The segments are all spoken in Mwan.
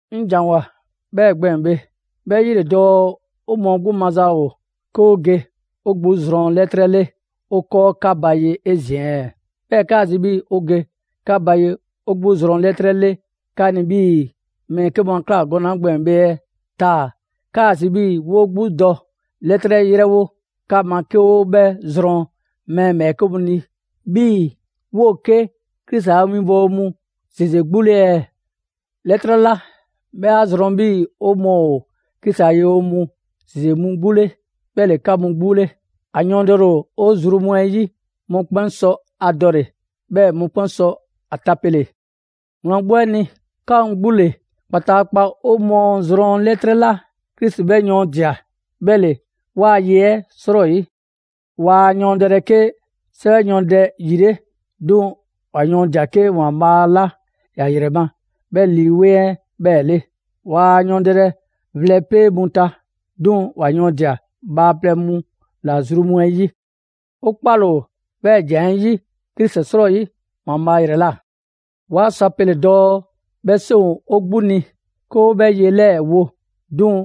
'Ŋ ‑janwoa 'bhɛ gbɛɛn‑ bhe, 'bhɛ 'yi ‑le dɔɔ 'o mɔɔ 'gbu maza ‑o 'ke 'o ge 'o 'gbu zrɔn 'lɛtrɛ 'le 'o 'kɔɔ 'ka ba ye 'ezin‑ ɛɛ? 'Bhɛɛ‑ 'kaa‑ zi 'bhii‑ 'o ge 'ka ba ye 'o 'gbu zrɔn 'lɛtrɛ 'le 'ka ni 'bhii‑ mɛɛ 'ke mu 'a ꞊kla gɔnɛ‑ 'la gbɛɛn‑ bhe ɛɛ, taa‑ 'kaa‑ zi 'bhii‑ 'woo 'gbu dɔ 'lɛtrɛ 'yrɛwo 'ka ma 'ke 'o 'bhɛ zrɔn mɛɛ ‑bhɛɛke' mu ni 'bhii‑ 'woo‑ 'ke Krisi a winbɔwo mu ‑zeze 'gbu 'le ɛɛ? 'Lɛtrɛ 'la 'bhɛ 'a zrɔn 'bhii‑ 'o mɔɔ ‑o Krisi a winbɔwo mu ‑zeze mu 'gbu 'le 'bhɛ ‑le 'ka mu 'gbu 'le. ‑A yɔɔndɛle ‑o 'o zru mu 'ɛ 'yi, mɔkpɛn' sɔ ‑a dɔle‑, 'bhɛɛ‑ mɔkpɛn' sɔ ‑a tapele. Wlan 'gbu 'ɛ ni, 'ka mu 'gbu ‑le kpataakpa 'o mɔɔ zrɔn 'lɛtrɛ 'la Krisi 'bhɛ yɔɔndia‑ 'bhɛ ‑le 'waa ye 'ɛ 'srɔyi. Waa yɔɔndɛlɛ 'ke 'sɛwɛ yɔɔndɛpɛ ‑yi 'le, 'duŋ‑ ‑wa yɔɔndia‑ 'ke ‑Waanbhaa' 'la ‑ya ‑yrɛ ma 'bhɛ Lii 'Weŋ 'ɛ 'bhɛɛ‑ 'le. Waa yɔɔndɛlɛ vlɛpee' mu ta, 'duŋ‑ ‑wa yɔɔndia‑ bhaaplɛŋ mu ‑la zru mu 'ɛ 'yi. 'O 'kpale‑ ‑o 'bhɛɛ‑ ‑jan 'ɛ 'yi Krisi 'srɔyi ‑Waanbhaa' ‑yrɛ ꞊la. 'Waa sɔ a pele‑ dɔɔ 'bhɛ 'seŋ ‑o 'o 'gbu ni 'ke 'o 'bhɛ ye 'lɛɛ‑ wo, 'duŋ‑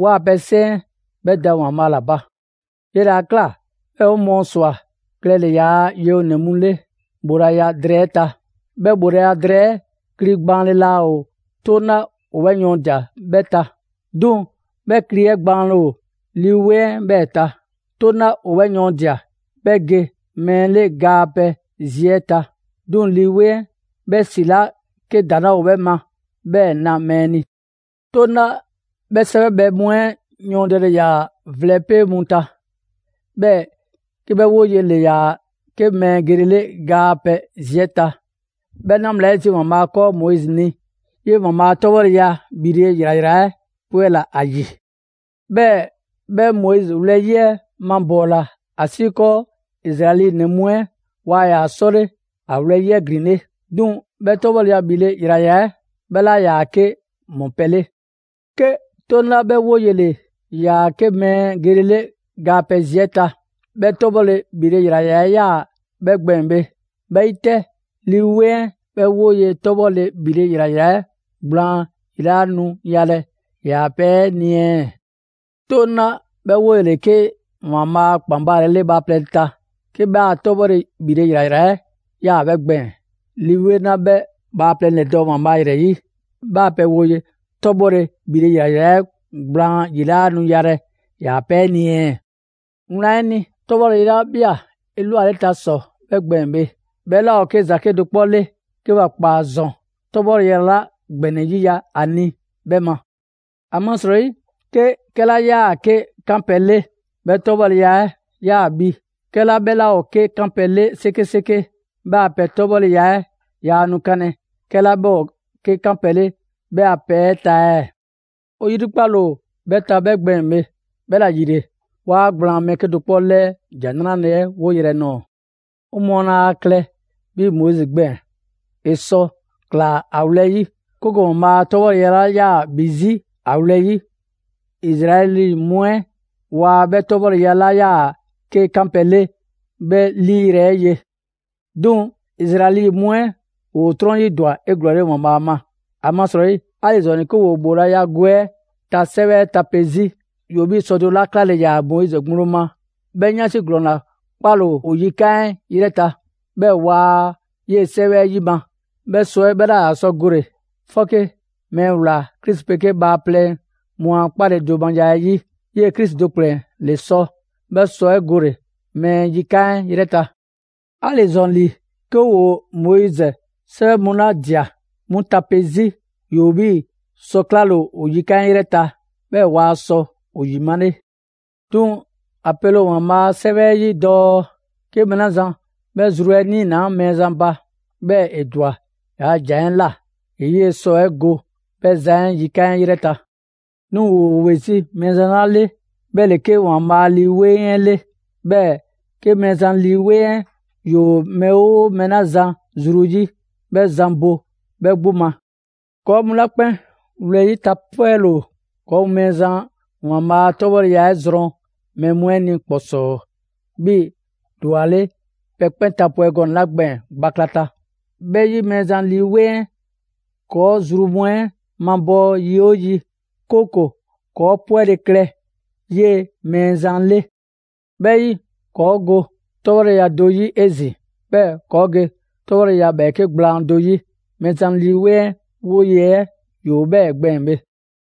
'waa‑ pɛ 'seŋ 'ɛ 'bhɛ da ‑Waanbhaa' ‑la ba. 'Yele‑ 'a ꞊kla 'bhɛɛ‑ 'o mɔɔ ‑swa klɛle‑ ‑yaa' yewonɛ mu 'le ‑bhoolaya drɛɛ 'ɛ ta. 'Bhɛ ‑bhoolaya drɛɛ 'ɛ kli gbaanle laa ‑o 'Toŋ 'la ‑o 'bhɛ yɔɔndia‑ 'bhɛ ta, 'duŋ‑ 'bhɛ kli 'ɛ gbaanle ‑o Lii 'Weŋ 'ɛ 'bhɛɛ‑ ta. 'Toŋ 'la ‑o 'bhɛ yɔɔndia‑ 'bhɛ ge mɛɛ 'le ga a pɛ zi 'ɛ ta, 'duŋ‑ Lii 'Weŋ 'ɛ 'bhɛ ‑si 'la 'ke ‑daŋ' 'laa ‑o 'bhɛ ma 'bhɛɛ‑ na mɛɛ ni. 'Toŋ 'la 'bhɛ 'sɛwɛbhɛ mu 'ɛ 'yɔɔndɛle ‑yaa vlɛpee' mu ta, 'bhɛɛ‑ 'ke 'bhɛ 'woye‑ ‑le ‑yaa 'ke mɛɛ gelele ga a pɛ zi 'ɛ ta, 'bhɛ 'na bhla 'ɛ zi ‑Waanbhaa' 'kɔɔ Moizi ni 'yee‑ ‑Waanbhaa' a 'tɔbhɔleya ‑bhile' ‑yrayra 'ɛ 'pwɛla‑ ‑a ‑yi. 'Bhɛɛ‑ 'bhɛ Moizi wlɛyi' 'ɛ mabɔɔla ‑asiikɔɔ Izraɛli ‑nɛ mu 'ɛ waa ‑yaa 'sɔle ‑a wlɛyi' 'ɛ ‑glinle'. 'Duŋ‑ 'bhɛ 'tɔbhɔleya ‑bhile' ‑yrayra 'ɛ 'bhɛ 'laa ‑yaa 'ke ‑mɔpɛ' 'le. 'Ke 'Toŋ 'la 'bhɛ 'woye‑ ‑le ‑yaa 'ke mɛɛ gelele ga a pɛ zi 'ɛ ta, 'bhɛ 'tɔbhɔleya ‑bhile' ‑yrayra 'ɛ 'yaa‑ 'bhɛ gbɛɛn‑ bhe, 'bhɛ 'yi 'tɛ, Lii 'Weŋ 'ɛ 'bhɛ 'woye‑ 'ɛ 'tɔbhɔleya ‑bhile' ‑yrayra 'ɛ gblaan ‑yi 'laa nu yalɛ‑ ‑yaa' pɛ 'ɛ ni ɛɛ? 'Toŋ 'la 'bhɛ 'woye‑ ‑le 'ke ‑Waanbhaa' a ‑kpan baalele bhaaplɛŋ ta, 'ke 'bhɛ a 'tɔbhɔleya ‑bhile' ‑yrayra 'ɛ 'yaa‑ 'bhɛ gbɛɛn‑, Lii 'Weŋ 'la 'bhɛ bhaaplɛŋ ‑lɛdɔɔ' ‑Waanbhaa' ‑yrɛ 'yi, 'bhɛ a pɛ 'woye‑ 'tɔbhɔleya ‑bhile' ‑yrayra 'ɛ gblaan ‑yi 'laa nu yalɛ‑ ‑yaa' pɛ 'ɛ ni ɛɛ? Wlan 'ɛ ni, 'tɔbhɔleya 'la ꞊bhia 'elwaleta ‑sɔ 'bhɛ gbɛɛn‑ bhe, 'bhɛ 'laa ‑o 'ke ‑za 'kedo‑ 'kpɔ 'le 'ke ‑wa ‑kpaa ‑zɔn 'tɔbhɔleya 'la ‑gbɛnɛ 'yiya‑ ‑a ni 'yi 'bhɛ ma. ‑Amasrɔyi, 'ke 'kɛla 'yaa‑ 'ke 'kanpɛ‑ 'le 'bhɛ 'tɔbhɔleya 'ɛ 'yaa‑ bhi, 'kɛla 'bhɛ 'laa ‑o 'ke 'kanpɛ‑ 'le 'sekeseke, 'bhɛ a pɛ 'tɔbhɔleya 'ɛ yaa nu 'kanlɛ‑ 'kɛla 'bhɛ ‑o 'ke 'kanpɛ‑ 'le 'bhɛ a pɛ 'ɛ ta ɛɛ? 'O 'yrikpale ‑o 'bhɛ ta 'bhɛ gbɛɛn‑ bhe, 'bhɛla‑ ‑yile, 'waa gblaan mɛɛ 'kedo‑ 'kpɔ 'lɛɛ ‑Jan 'Nrale‑ 'ɛ 'woyrɛ‑ nɔɔ‑. 'O mɔɔ laa ‑a klɛ 'bhii‑ Moizi gbɛɛn‑. ‑E sɔ ꞊klaa ‑a wlɛyi', 'kooko‑ ‑Waanbhaa' a 'tɔbhɔleya 'la 'yaa‑ ‑bhi 'zi ‑a wlɛyi', Izraɛli mu 'ɛ waa 'bhɛ 'tɔbhɔleya 'la 'yaa‑ 'ke 'kanpɛ‑ 'le 'bhɛ 'liiyrɛ‑ 'ɛ ye. 'Duŋ‑ Izraɛli mu 'ɛ ‑woo 'trɔn 'yi ‑dwa 'eglɔɔle ‑Waanbhaa' ma. ‑Amasrɔyi 'ali‑ ‑zɔn ‑li, 'ke ‑woo ‑bhoolaya gwe 'ɛ ta 'sɛwɛ 'ɛ tape 'zi, ‑yoo 'bhii‑ sɔ do 'la 'klale‑ ‑yaa Moizi ŋgblo ma 'bhɛ 'yansi ‑glɔɔn ‑la 'kpale‑ ‑o yikan' 'ɛ 'yrɛ ta. 'Bhɛɛ‑ waa 'yee‑ 'sɛwɛ 'ɛ 'yima‑. 'Bhɛ sɔ 'ɛ 'bhɛ 'laa sɔ gole‑ 'fɔke mɛɛ ꞊wlaa Krisi 'pegee bhaaplɛŋ mu a 'kpaledomaya 'ɛ 'yi; 'yee‑ Krisi do ‑kplɛn ‑le sɔ 'bhɛ sɔ 'ɛ gole‑ mɛɛ yikan' 'ɛ 'yrɛ ta. 'Ali‑ ‑zɔn ‑li, 'ke ‑woo Moizi 'sɛwɛ mu 'la ꞊dia 'mu tape 'zi, ‑yoo 'bhii‑ sɔ 'klale ‑o yikan' 'ɛ 'yrɛ ta; 'bhɛɛ waa sɔ ‑o ‑yimale. 'Duŋ‑ ‑a pele ‑o ‑Waanbhaa' a 'Sɛwɛ 'ɛ 'yi dɔɔ: «'Ke mɛɛ 'la zan 'bhɛ zru 'ɛ 'niinaa‑ Mɛɛzan ba, 'bhɛɛ‑ ‑e ‑dwa ‑yaa' ‑jan 'ɛ ꞊la, ‑e 'yee‑ sɔ 'ɛ go 'bhɛ zan 'ɛ yikan' 'ɛ 'yrɛ ta.» 'Duŋ‑ 'woo‑ ‑we 'zi Mɛɛzan 'la le, 'bhɛ ‑le 'ke ‑Waanbhaa' Lii 'Weŋ 'ɛ 'le. 'Bhɛɛ‑ 'ke Mɛɛzan Lii 'Weŋ 'ɛ ‑yoo mɛɛ 'oo mɛɛ 'la zan zru 'yi, 'bhɛ zan bo 'bhɛ 'gbu ma. ‑Kɔɔ' mu 'la 'kpɛn wlɛyi' tapwɛle ‑o, 'kɔɔ‑ mu Mɛɛzan ‑Waanbhaa' a 'tɔbhɔleya 'ɛ zrɔn mɛɛ mu 'ɛ ni ‑kpɔsɔɔ 'bhii‑ ‑dwaleŋ' pɛ 'kpɛn tapwɛ gɔnɛ‑ 'la gbɛɛn‑ gbaklata. 'Bhɛ 'yi Mɛɛzan Lii 'Weŋ 'ɛ ‑kɔɔ' zru mu 'ɛ mabɔɔ yi 'oo yi, 'kooko‑ ‑kɔɔ' 'pwɛle‑ klɛ 'yee‑ Mɛɛzan 'le. 'Bhɛ 'yi, ‑kɔɔ' go 'tɔbhɔleya do 'yi 'ezin‑, 'bhɛɛ‑ ‑kɔɔ' ge 'tɔbhɔleya ‑bhɛɛke' gblaan do 'yi. Mɛɛzan Lii 'Weŋ 'ɛ 'woye‑ 'ɛ ‑yoo 'bhɛɛ‑ gbɛɛn‑ bhe.